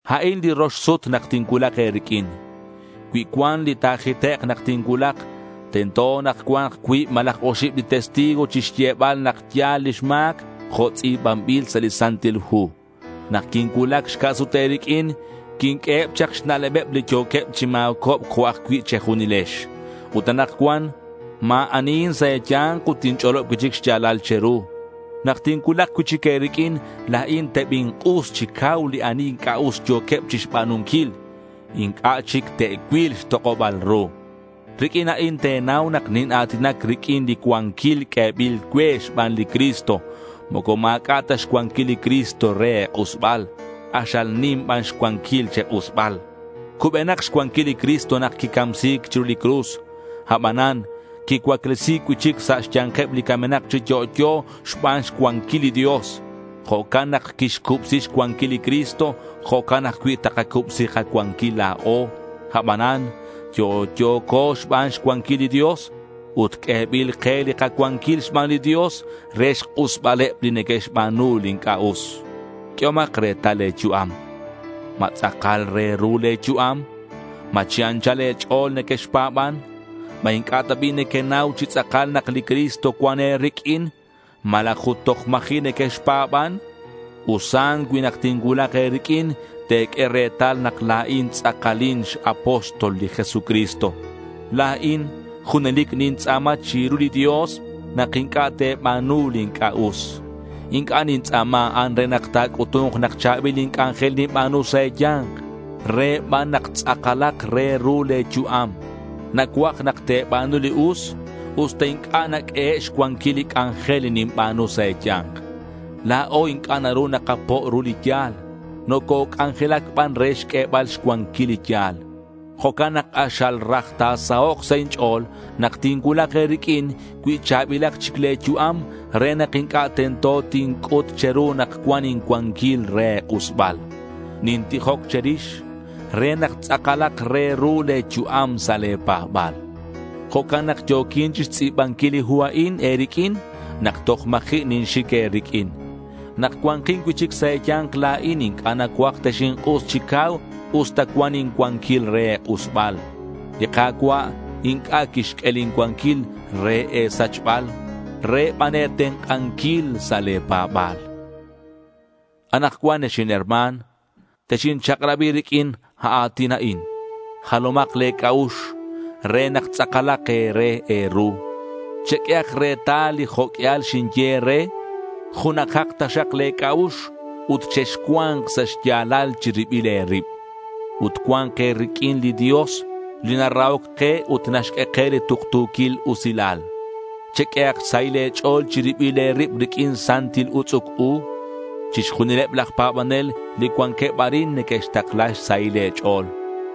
A'in li rox sut nak tincuulak e̱riq'uin. Cui cuan li ta̱jitek' nak tincuulak, tento nak cua̱nk cuib malaj oxib li testigo chixyebal nak ya̱l lix ma̱c, jo' tz'i̱banbil sa' li Santil Hu. Nak quincuulac xca' sut e̱riq'uin, quinq'ueheb chak xna'lebeb li yo̱queb chi ma̱cobc jo' ajcui' che̱junilex. Ut anakcuan ma̱ anihin sa' e̱ya̱nk ut tinch'olob cui'chic xya̱lal che̱ru. Nak tincuulak cui'chic e̱riq'uin, la̱in tebink'us chi cau li ani inc'a' us yo̱queb chixba̱nunquil. Inc'a' chic te'cuil xtok'oba̱l ru. Riq'uin a'in te̱nau nak nina̱tinac riq'uin li cuanquil q'uebil cue xban li Cristo. Moco ma̱c'a' ta xcuanquil li Cristo re e̱k'usbal. K'axal nim ban xcuanquil che̱k'usbal. Cubenak xcuanquil li Cristo nak quicamsi̱c chiru li cruz. Abanan quicuaclesi̱c cui'chic sa' xya̱nkeb li camenak chi yo'yo xban xcuanquil li Dios. Jo' nak quixcubsi xcuanquil li Cristo, jo'can ajcui' takacubsi kacuanquil la̱o. Abanan yo'yo̱co xban xcuanquil li Dios ut q'uebil ke li kacuanquil xban li Dios re xk'usbaleb li neque'xba̱nu li inc'a' us. Q'uehomak retal le̱ yu'am. ¿Ma tz'akal re ru le̱ yu'am? ¿Ma chi anchal e̱ch'o̱l nequexpa̱ban? ¿Ma inc'a' ta bi' nequenau chi tz'akal nak li Cristo cuan e̱riq'uin? ¿Malaj ut toj ma̱ji' nequexpa̱ban? Usan cui nak tincuulak e̱riq'uin, te̱q'ue retal nak la̱in tz'akalin x-apóstol li Jesucristo. La̱in junelic nintz'a̱ma chiru li Dios nak inc'a' te̱ba̱nu li inc'a' us. Inc'a' nintz'a̱ma a'an re nak ta̱c'utu̱nk nak cha̱bil li c'anjel ninba̱nu sa' e̱ya̱nk. Re ban nak tz'akalak re ru le̱ yu'am. Nacuaj nak te̱ba̱nu li us usta inc'a' naq'uehe' xcuanquil li c'anjel li ninba̱nu sa' e̱ya̱nk. La̱o inc'a' naru nakapo' ru li ya̱l. Nococ'anjelac ban re xq'uebal xcuanquil li ya̱l. Jo'can nak k'axal raj ta̱sahok' sa' inch'o̱l nak tincuulak e̱riq'uin cui cha̱bilak chic le̱ yu'am re nak inc'a' tento tinc'ut che̱ru nak cuan incuanquil re e̱k'usbal. Nintijoc che̱rix re nak tz'akalak re ru le̱ yu'am sa' le̱ pa̱ba̱l. Jo'can nak yo̱quin chixtz'i̱banquil li hu a'in e̱riq'uin nak toj ma̱ji' ninxic e̱riq'uin. Nak cua̱nkin cui'chic sa' e̱ya̱nk la̱in inc'a' nacuaj texink'us chi cau usta cuan incuanquil re e̱k'usbal. Li Ka̱cua' inc'a' quixq'ue lin cuanquil re e̱sachbal. Re ban e̱tenk'anquil sa' le̱ pa̱ba̱l. Anakcuan ex inherma̱n, texinchak'rabi riq'uin a a̱tin a'in: Jalomak le̱ c'a'ux re nak tz'akalak e̱re e̱ru. Cheq'uehak retal li jo' q'uial xinye e̱re. Junajak taxak le̱ c'a'ux ut chexcua̱nk sa' xya̱lal chi ribil e̱rib. Ut cua̱nk e̱riq'uin li Dios li narahoc ke ut naxq'ue ke li tuktu̱quil usilal. Cheq'uehak xsahil e̱ch'o̱l chi ribil e̱rib riq'uin santil utz'uc u. Chixjunileb laj pa̱banel li cuanqueb arin neque'xtakla xsahil e̱ch'o̱l.